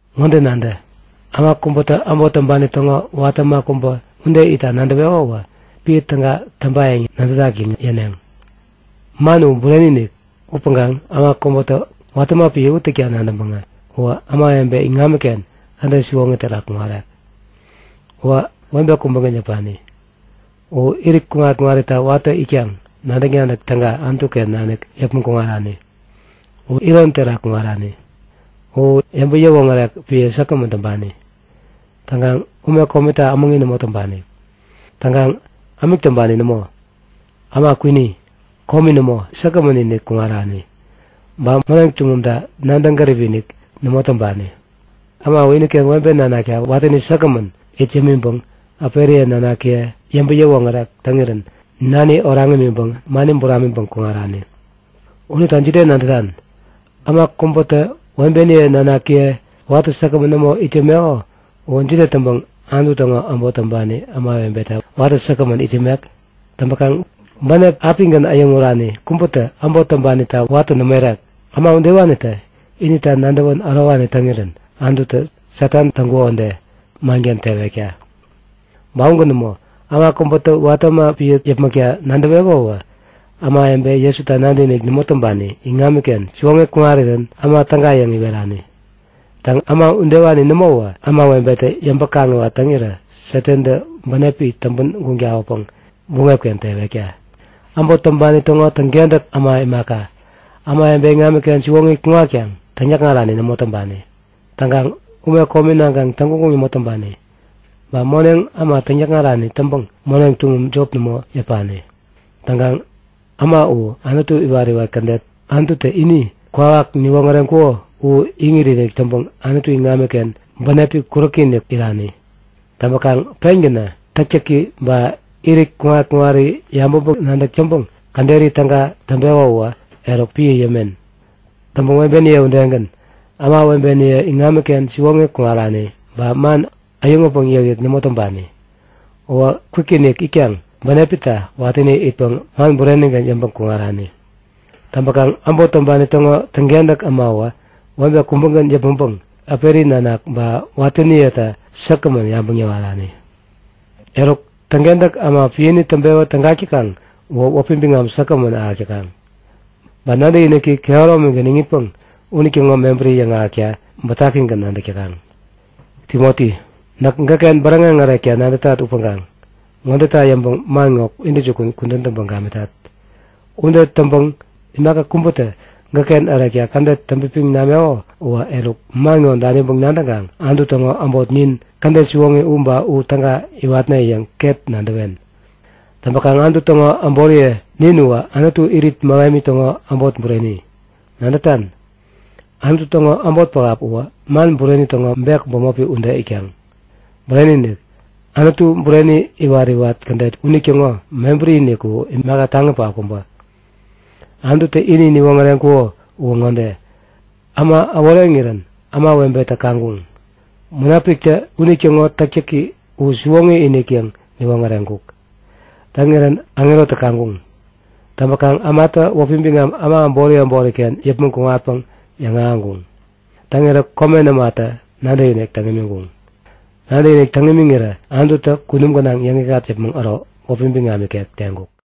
Ŋode nadä; Äma kubätä äbot täŋpani täŋo watä äma kubä ude itta nadäweko uwä piä täga täŋpayäŋ nadätak yäŋ yäneŋ. Man u bureni-inik. Upäŋkaŋ äma kubätä watä äma piä u täkta nadäŋpäŋä uwä ämawebe iŋamiken kädet siwoŋi terak kuŋarek. Uwä webe kubägän yäpani. U irit kuŋat-kuŋarita watäni itkaŋ nadäk-nadäk täga Anutu-ken nanik yäpmäŋ kuŋarani. U iron terak kuŋarani. U yäŋpäŋ-yäwoŋärek piä säkgämän täŋpani. Täŋkaŋ ume komita ämäŋi nämo täŋpani. Täŋkaŋ ämik täŋpani nämo, äma kwini, komi nämo, säkgämän-inik kuŋarani. Ba moneŋ tuŋumta nadäŋ gäripi-inik nämo täŋpani. Äma uwä iniken webe nanakta watäni säkgämän it yämiŋpäŋ äperiye nanakiye yäŋpäŋ-yäwoŋärek täŋirän nani oraŋ imiŋpäŋ mani buramiŋpäŋ kuŋarani. Unita jide nadätan? Äma kubätä webeni nanakiye watä säkgämän nämo it yämeko uwä jide täŋpäŋ Anutu täŋo äbot täŋpani ämawebeta watä säkgämän it yämek? Täŋpäkaŋ bänep apigän äyäŋurani kubätä äbot täŋpanita watä nämo irek. Äma udewanitä inita nadäwän ärowani täŋirän Anututä Satanta täŋkuko ude, manken tewekta. Ba ugän nämo. Äma kubätä watä äma piä yäpmäkta nadäweko uwä ämawebe Jesuta nadäkinik nämo täŋpani iŋamiken siwoŋi kuŋarirän äma täga yäŋ iwerani. Täŋ, äma udewani nämowä ämawebetä yäŋpäŋ-kaŋiwat täŋirä Satantä bänepi täŋpän guŋ tawäpäŋ buŋep-ken tewekta. Äbot täŋpani täŋo täŋkentäk äma imaka, ämawebe iŋamiken siwoŋi kuŋatkaŋ täŋyäkŋarani nämo täŋpani. Täŋkaŋ ume komi naŋkaŋ täŋguŋguŋ nämo täŋpani. Ba moneŋ äma täŋyäkŋarani täŋpäŋ moneŋ tuŋum jop nämo yäpani. Täŋkaŋ äma u Anutu iwat-iwat kädet Anututä ini kwawak niwoŋäreŋkuko u iŋit-inik täŋpäŋ Anutu iŋamiken bänepi kuräki-inik irani. Täŋpäkaŋ pengänä täktäki ba irit kuŋat-kuŋari yabäŋpäŋ-nadäk täŋpäŋ käderi täga täŋpeko uwä, eruk piä yämen. Täŋpäŋ webeniye udegän, ämawebeniye iŋamiken siwoŋi kuŋarani ba man äyäŋutpäŋ yäkyäk nämo täŋpani. Uwä kwikinik itkaŋ bänepita watäni itpäŋ man burenigän yäŋpäŋ kuŋarani. Täŋpäkaŋ äbot täŋpani täŋo täŋkentäk äma uwä webe kubägän yäpmäŋpäŋ äperi nanak ba watäniyeta säkgämän yabäŋ yäwarani. Eruk, täŋkentäk äma piäni täŋpewä tägak täkaŋ uwä wäpi biŋam säkgämän ahäk täkaŋ. Ba nadäkiniki kehäromigän iŋitpäŋ unitäŋo mebäri yäŋahäkta bätakigän nadäk täkaŋ. Timoti, näk gäkken bäräŋeŋ ärekta nadätat upäŋkaŋ ŋodeta yäŋpäŋ man ŋo intäjukun kudän täŋpäŋ gamitat. Ude täŋpäŋ imaka kubätä gäkken ärekta kädet täŋpipiŋ nameko uwä, eruk man ŋo daniŋpäŋ nadäŋkaŋ Anutu täŋo äbot nin kädet siwoŋi u ba u täga iwatne yäŋ ket nadäwen. Täŋpäkaŋ Anutu täŋo äboriye nin uwä Anutu irit mähemi täŋo äbot bureni. Nadätan? Anutu täŋo äbot pähap uwä man bureni täŋo meham ba bek bämopi ude itkaŋ. Bureni-inik, Anutu Bureni iwat-iwat kädet unitäŋo mebäri-inik u imaka taŋi pähap kubä! Anututä ini niwoŋäreŋkuko uwä ŋode; Äma äworeŋirän ämawebetä kaŋkuŋ. Munapiktä unitäŋo täktäki u siwoŋi-inik yäŋ niwoŋäreŋkuk. Täŋirän aŋerotä kaŋkuŋ. Täŋpäkaŋ ämatä wäpi biŋam äma äbori äboriken yäpmäŋ kuŋatpäŋ yäŋahäŋkuŋ. Täŋirä komen ämatä nadäkinik täŋ imiŋkuŋ. Nadäkinik täŋ imiŋirä Anututä kunum gänaŋ yäŋikŋat yäpmäŋ äro wäpi biŋam ikek teŋkuk.